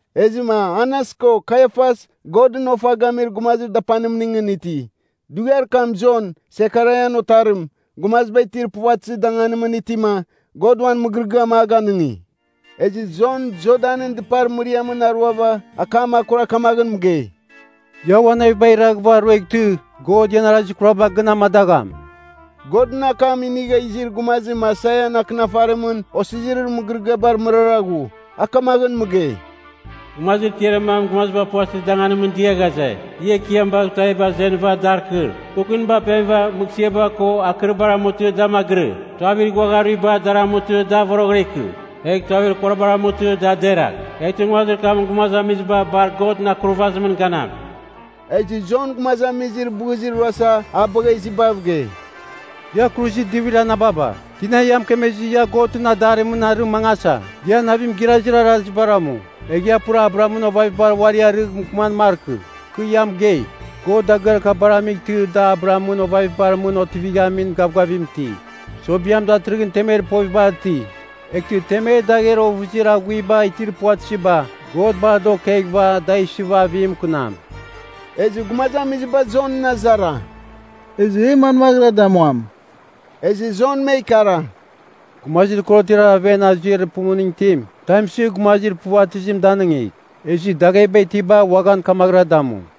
Ezɨma Anas ko Kaiafas Godɨn ofa gamir gumazir dapanimningɨn iti. Dughiar kam Jon, Sekaraian otarim, gumaziba itir puvatɨzir danganimɨn itima, God uan mɨgɨrɨgɨam a ganɨngi. Ezɨ Jon Jordanɨn dɨpar mɨriamɨn aruava akam kura kamaghɨn mɨgei, “Ia uan navibagh iraghɨva rueghtɨ, God ian arazir kuraba gɨn amadagham.” Godɨn akam inigha izir gumazim Aisaian akɨnafarimɨn osirizir mɨgɨrɨgɨabar mɨrara ghu, a kamaghɨn mɨgei, “Gumazir tiarir mam gumaziba puvatɨzir danganimɨn dia ghaze, ‘Ia Ekiam baghɨva tuaviba azenɨva, dar kɨr. Kukuniba apemɨva, mɨghsɨaba ko akɨribar amutɨ da magɨrɨ. Tuavir ighuagha aruiba dar amutɨ da voroghɨra ikɨ. Egh tuavir kurabar amutɨ da deragh. Eghtɨ nguazir kamɨn gumazamiziba bar Godɨn akurvazimɨn ganam.’” Ezɨ Jon gumazamizir bɨzir ruasa a bagha izibav gei, “Ia kuruzir divir anababa! Tina ia mɨkemezɨ ia Godɨn adarimɨn arɨ mangasa? Ia navim girazir arazibara amu. Egh ia pura Abrahamɨn ovavibar uari arɨgh mɨkɨman markɨ. Kɨ ia mɨgei, God dagɨar kabara amightɨ da Abrahamɨn ovavibar mɨn otivighamin gavgavim iti. Sobiam datɨrɨghɨn temer povibar iti, eghtɨ temer dagher ovɨzir aghuiba itir puvatɨziba, God bar da okeghɨva da isɨva avim mɨkɨnam.” Ezɨ gumazamiziba Jonɨn azara, “Ezɨ e manmaghɨra damuam?” Ezɨ Jon me ikara, “Gumazir korotiar aven azuir pumuning itim, tam isɨ gumazir puvatɨzim danɨngigh. Ezɨ dagheba itiba uaghan kamaghɨra damu.”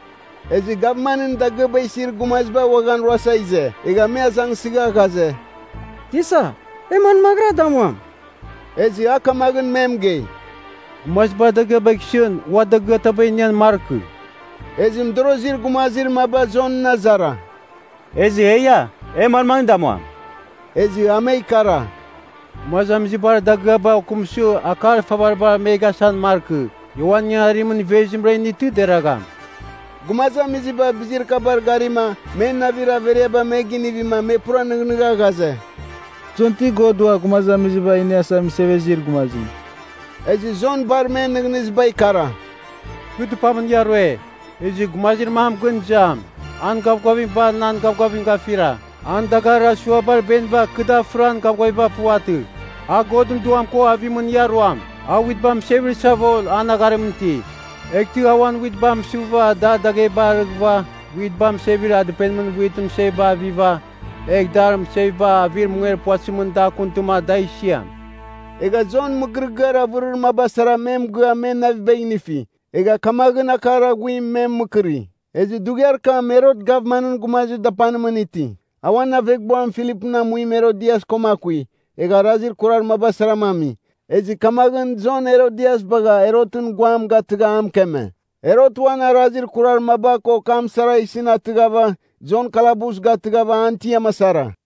Ezɨ gavmanɨn dagɨaba isir gumaziba uaghan ruasa ize. Egha me azangsɨgha ghaze, “Tisa, e manmaghɨra damuam?” Ezɨ a kamaghɨn me mɨgei, “Gumazibar dagɨabagh isɨn ua dagɨataba inian markɨ.” Ezɨ mɨdorozir gumazir maba Jonɨn azara, “Ezɨ eia, e manmaghɨn damuam?” Ezɨ a me ikara, “Gumazamizibar dagɨaba okɨmsɨva akar ifavaribar me gasan markɨ. Ia uan ingangarimɨn ivezimra initɨ deragham.” Gumazamiziba bizir kabar garima men navir averiaba me ginivima me pura nɨghnɨgha ghaze, Jon ti God Ua Gumazamiziba Iniasa Mɨsevezir Gumazim? Ezɨ Jon bar men nɨghnɨziba ikara, “Kɨ dɨpamɨn ia rue. Ezɨ gumazir mam gɨn izam, an gavgavim bar nan gavgavim gafira. An dagarir asuabar beniba kɨ da firan gavgaviba puvatɨ. A Godɨn Duam ko avimɨn ia ruam. A witba mɨsevir savol an agharimɨn iti, eghtɨ a uan witba mɨsɨva dar daghebar arɨghɨva, witba mɨsevir dɨpenimɨn witɨn mɨseviba aviva, egh dar mɨseviba avir munger puvatɨzimɨn da akuntɨma, da isiam.” Egha Jon mɨgɨrɨgɨar avɨrir maba sara me mɨgɨa men navibagh inifi. Egha kamaghɨn akar aghuim me mɨkɨri. Ezɨ dughiar kam Herot gavmanɨn gumazir dapanimɨn ti. A uan aveghbuam Filipɨn amuim Herodias koma akui, egha arazir kurar maba sarama ami. Ezɨ kamaghɨn Jon Herodias bagha Herotɨn guam gatɨgha a mɨkeme. Herot uan arazir kurar maba ko kam sara isɨn atɨghava, Jon kalabus gatɨghava an tiam asara.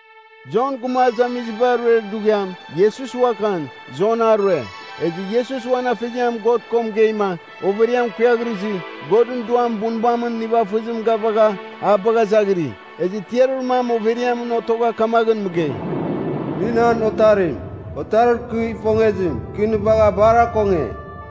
Jon gumazamiziba ruer dughiam, Iesus uaghan, Jon a rue. Ezɨ Iesus uan afeziam God ko mɨgeima, overiam kuiaghrɨzɨ, Godɨn Duam bunbamɨn nivafɨzim gavagha a bagha izaghiri. Ezɨ tiarir mam overiamɨn otogha kamaghɨn mɨgei, “Nɨ nan Otarim, Otarir kɨ ifongezim. Kɨ nɨ bagha bar akonge.”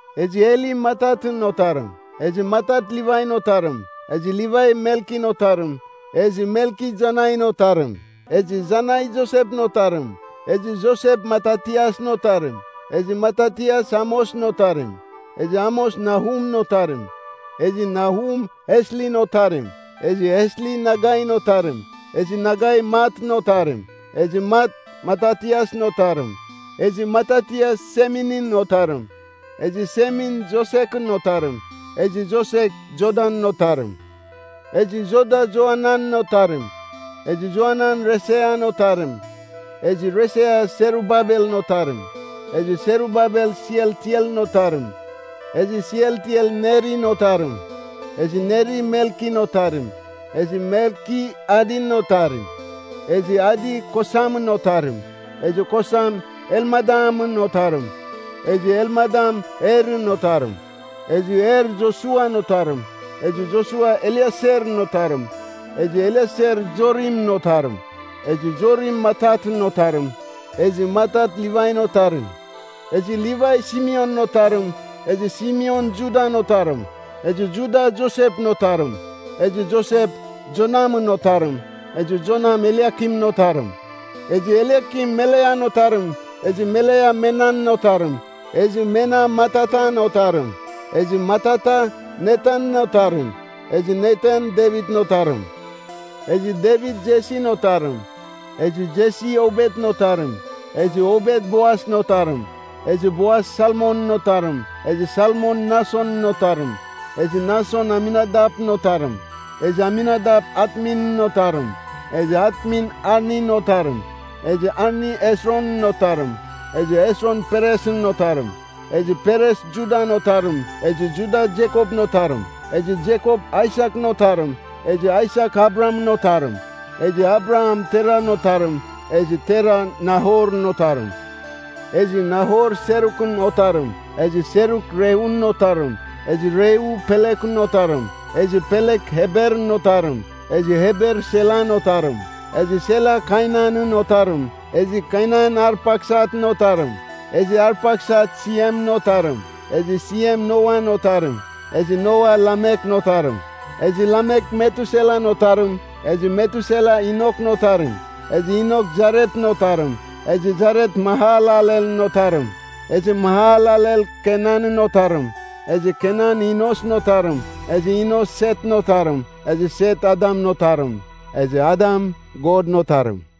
Ezɨ Heli Matatɨn otarim. Ezɨ Matat Livain otarim. Ezɨ Livai Melkin otarim. Ezɨ Melki Janain otarim. Ezɨ Janai Josepɨn otarim. Ezɨ Josep Matatiasɨn otarim. Ezɨ Matatias Amosɨn otarim. Ezɨ Amos Nahumɨn otarim. Ezɨ Nahum Eslin otarim. Ezɨ Esli Nagain otarim. Ezɨ Nagai Matɨn otarim. Ezɨ Mat Matatiasɨn otarim. Ezɨ Matatias Seminɨn otarim. Ezɨ Semin Josekɨn otarim. Ezɨ Josek Jodan otarim. Ezɨ Joda Joananɨn otarim. Ezɨ Joanan Resean otarim. Ezɨ Resea Serubabelɨn otarim. Ezɨ Serubabel Sealtielɨn otarim. Ezɨ Sealtiel Nerin otarim. Ezɨ Neri Melkin otarim. Ezɨ Melki Adin otarim. Ezɨ Adi Kosamɨn otarim. Ezɨ Kosam Elmadamɨn otarim. Ezɨ Elmadam Erɨn otarim. Ezɨ Er Josuan otarim. Ezɨ Josua Elieserɨn otarim. Ezɨ Elieser Jorimɨn otarim. Ezɨ Jorim Matatɨn otarim. Ezɨ Matat Livain otarim. Ezɨ Livai Simeonɨn otarim. Ezɨ Simeon Judan otarim. Ezɨ Juda Josepɨn otarim. Ezɨ Josep Jonamɨn otarim. Ezɨ Jonam Eliakimɨn otarim. Ezɨ Eliakim Melean otarim. Ezɨ Melea Menan otarim. Ezɨ Mena Matatan otarim. Ezɨ Matata Natanɨn otarim. Ezɨ Natan Devitɨn otarim. Ezɨ Devit Jesin otarim. Ezɨ Jesi Obetɨn otarim. Ezɨ Obet Boasɨn otarim. Ezɨ Boas Salmonɨn otarim. Ezɨ Salmon Nasonɨn otarim. Ezɨ Nason Aminadapɨn otarim. Ezɨ Aminadap Atminɨn otarim. Ezɨ Atmin Arnin otarim. Ezɨ Arni Hesronɨn otarim. Ezɨ Hesron Peresɨn otarim. Ezɨ Peres Judan otarim. Ezɨ Juda Jekopɨn otarim. Ezɨ Jekop Aisakɨn otarim. Ezɨ Aisak Abrahamɨn otarim. Ezɨ Abraham Teran otarim. Ezɨ Tera Nahorɨn otarim. Ezɨ Nahor Serukɨn otarim. Ezɨ Seruk Reun otarim. Ezɨ Reu Pelekɨn otarim. Ezɨ Pelek Eberɨn otarim. Ezɨ Eber Selan otarim. Ezɨ Sela Kainanɨn otarim. Ezɨ Kainan Arpaksatɨn otarim. Ezɨ Arpaksat Siemɨn otarim. Ezɨ Siem Noan otarim. Ezɨ Noa Lamekɨn otarim. Ezɨ Lamek Metuselan otarim. Ezɨ Metusela Enokɨn otarim. Ezɨ Enok Jaretɨn otarim. Ezɨ Jaret Mahalalelɨn otarim. Ezɨ Mahalalel Kenanɨn otarim. Ezɨ Kenan Enosɨn otarim. Ezɨ Enos Setɨn otarim. Ezɨ Set Adamɨn otarim. Ezɨ Adam Godɨn otarim.